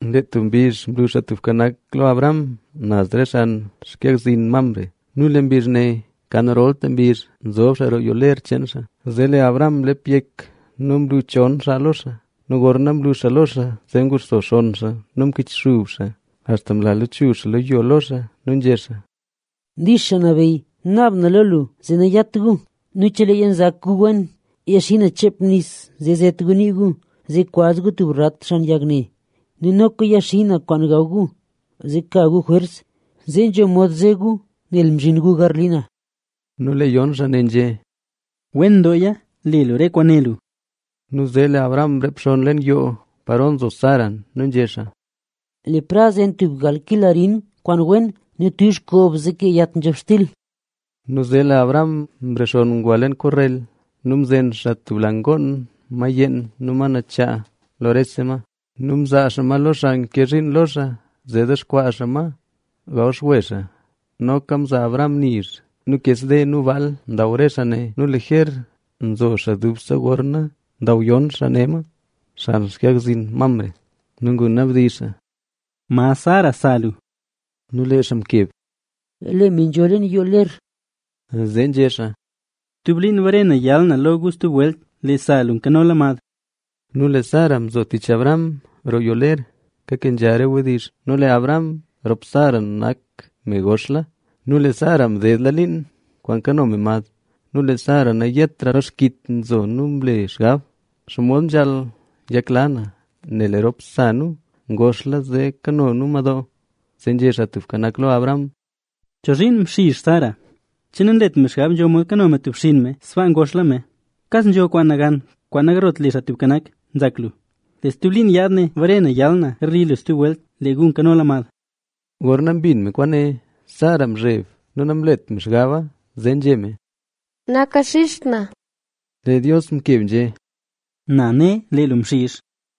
Lee tub mbizh mlu Xaa Tubka Nak lo Abraham naz xan xkag zin Mamre nu lee mbizh ne kan rolta mbizh nzob xaa roo yoo ler cheen xaa. Zee lee Abraham mlep yek nu mlu chon xaa lo xaa. Nu gorna mlu xaa lo xaa zee nguxso xonn xaa nu mkichxub xaa axta mla lachuzh xaa lo yo lo xaa nu nzhé xaa: —Dix xaa nabeyy. Naab na lo lu zee nanyat gu. Nu cheleeya nzak gu wena, yaxi na cheep nis zee zet gu nii gu, zee kwaz gu tub rat xan yag ne. Nu noka yaxi na kwaan gaw gu, zee ka gu jwers, zee nzho mod ze gu, nel mzhin gu garli na. Nu lee yon xaa ne nzhé: —Wen dooya. Le lu re kwaan né lu. Nu zee lee Abraham mreep xonn leen yoo paro nzo Sara nu nzhé xaa: —Le prad zen tub gal kil arin kwaan wen nu tuuzh koob zee kee yat nzhob xtil. Nu zee lee Abraham mrexonn ngwa leen korrel nu mzen xaa tub la ngoon yeen, ma yeen nu ma nachaa lo rese ma. Nu mzaa xaa ma lo xaa nke zhiin lo xaa zee dexkwaa xaa ma gawxwe xaa. Noka mzaa Abraham nizh nu kes nu ngoon yeen ma mdexkwaa xaa. Nu liger nzo xaa dubse gorna ndaw yon xaa ne ma, xan xkag zin Mamre. Nu ngunabdizh xaa: —¿Ma Sara, sa lu? Nu lee xaa mkeb: —Lee me nzho leen yoo ler. Zee nzhé xaa: —Stub liin bare na yal na lo gu stub welt, lee sa lu nkanola mad. Nu lee Sara mzo tich Abraham roo yoo ler kakenzha re wdizh. Nu lee Abraham rop Sara ngoxla. Nu lee Sara mdedla liin kwaan kano me mad. Nu lee Sara nayetra lo xkit nzo nu mle xgab: “¿Xomod nzhaal yakla na, nel lee rop sa nu ngoxla zee kano nu madoo?” Zee nzhé Xaa Tubka Nak lo Abraham: —¿Chozhiin mxizh Sara? ¿Che nanlet me xgab nzho mod kano me tub xinn me sbaa ngoxla me? ¿Kas nzho kwaan nagan kwaan nagarlot le Xaa Tubka Nak, nzak lu? Lee stub liin yaad ne bare na yal na garli lu stub welt, lee gu nkanola mad. Gorna mbin me kwaane, Sara mzheb nu namlet me xgaba, zee nzhé me: —Nakaxizht na. Lee Dios mkeb nzhé: —Ne na, lee lu mxizh.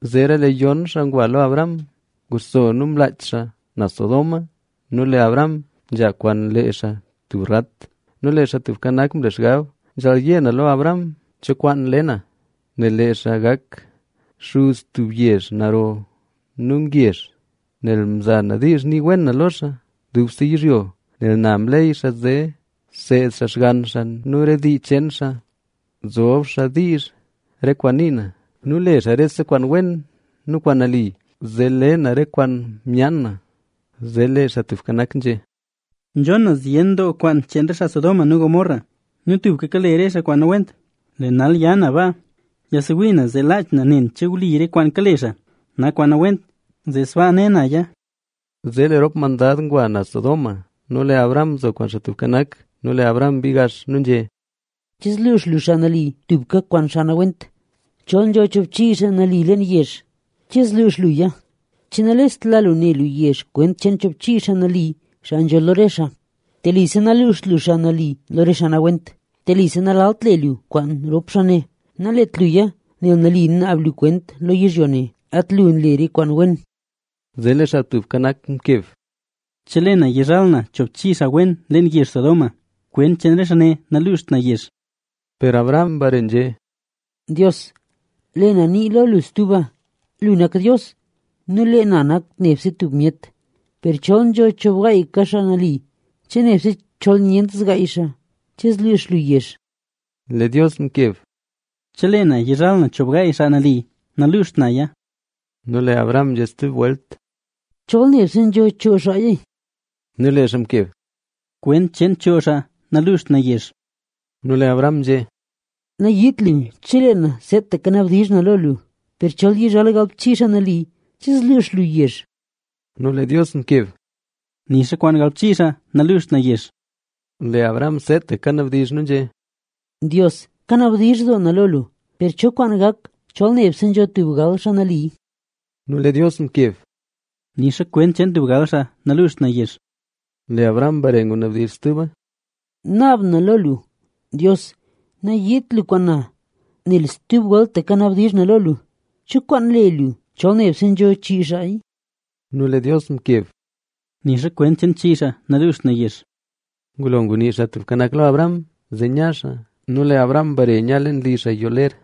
Zeera lee yon xaa ngwa lo Abraham, nguxso nu mlaach xaa naz Sodoma nu lee Abraham nzha kwaan lee xaa tub rat. Nu lee Xaa Tubka Nak mle xgab: “Nzhaal yé na lo Abraham cho kwaan le na, nel lee xaa gak xuz tub yezh naro nu ngezh. Nel mza na diizh nii wen na lo xaa dubse yizhyo. Nel na mleey xaa zee seed xaa xgann xaa nu re dii cheen xaa, zob xaa diizh re kwaan nii na nu le xaa rese kwaan wen nu kwaan nali, zee le na re kwaan myaan na.” Zee lee Xaa Tubka Nak nzhé: —Nzhon na zyen doo kwaan cheen re xaa Sodoma nu Gomorra; nu tubka kale re xaa kwaan nawent. Lee nal ya na baa, yasewii na zee laach na nen che wli re kwaan kale xaa, nak kwaan nawent, zee sbaa ne naya. Zee lee rop mandad ngwa naz Sodoma nu lee Abraham nzo kwaan Xaa Tubka Nak. Nu lee Abraham mbii gax nu nzhé: —¿Che zluux lu xaa nali tubka kwaan xaa nawent? Chol nzho choobchii xaa nali leen yezh, ¿che zluux luya? ¿Che nalest la lu ne lu yezh kwent cheen choobchii xaa nali, xaa nzho lo re xaa? Telise naluuxt lu xaa nali lo re xaa nawent. Telise nalalt le lu kwaan rop xaa ne. ¡Nalet luya! Nel nali naab lu kwent lo yizhyo ne. ¡At lu nle re kwaan wen! Zee lee Xaa Tubka Nak mkeb: —Chelee na yizhal na choobchii xaa wen leen yezh Sodoma, kwent cheen re xaa ne naluuxt na yezh. Per Abraham mbare nzhé: —Dios, lee na nii lo lu stuba. Lu nak Dios nu lee na nak nebse tub myet. Per chol nzho choobgaayaka xaa nali, che nebse chol nyent zgaay xaa, ¿che zluux lu yezh? Lee Dios mkeb: —Chelee na yizhal na choobgaay xaa nali, naluuxt naya. Nu lee Abraham nzhé stub welt: —¿Chol nebse nzho choo xaaya? Nu lee xaa mkeb: —Kwent cheen choo xaa naluuxt na yezh. Nu lee Abraham nzhé: —Nayiit lu chelee na seetaka nabdizh na lo lu. Per chol yizhal galbchii xaa nali, ¿che zluux lu yezh? Nu lee Dios mkeb: —Nixa kwaan galbchii xaa naluuxt na yezh. Lee Abraham seetaka kanabdizh nu nzhé: —Dios, kanabdizh doo na lo lu, ¿per cho kwaan gak chol nebse nzho tub gal xaa nali? Nu lee Dios mkeb: —Nixa kwent cheen tub gal xaa naluuxt na yezh. Lee Abraham mbare ngunabdizh stuba: —Naab na lo lu, Dios, nayiit lu lo na, nel stub weltaka nabdizh na lo lu, ¿cho kwaan le lu chol nebse nzho chii xaaya? Nu lee Dios mkeb: —Nixa kwent cheen chii xaa naluuxt na yezh. Ngulo ngunii Xaa Tubka Nak lo Abraham, zee nya xaa nu lee Abraham mbare nya leen li xaa yoo ler.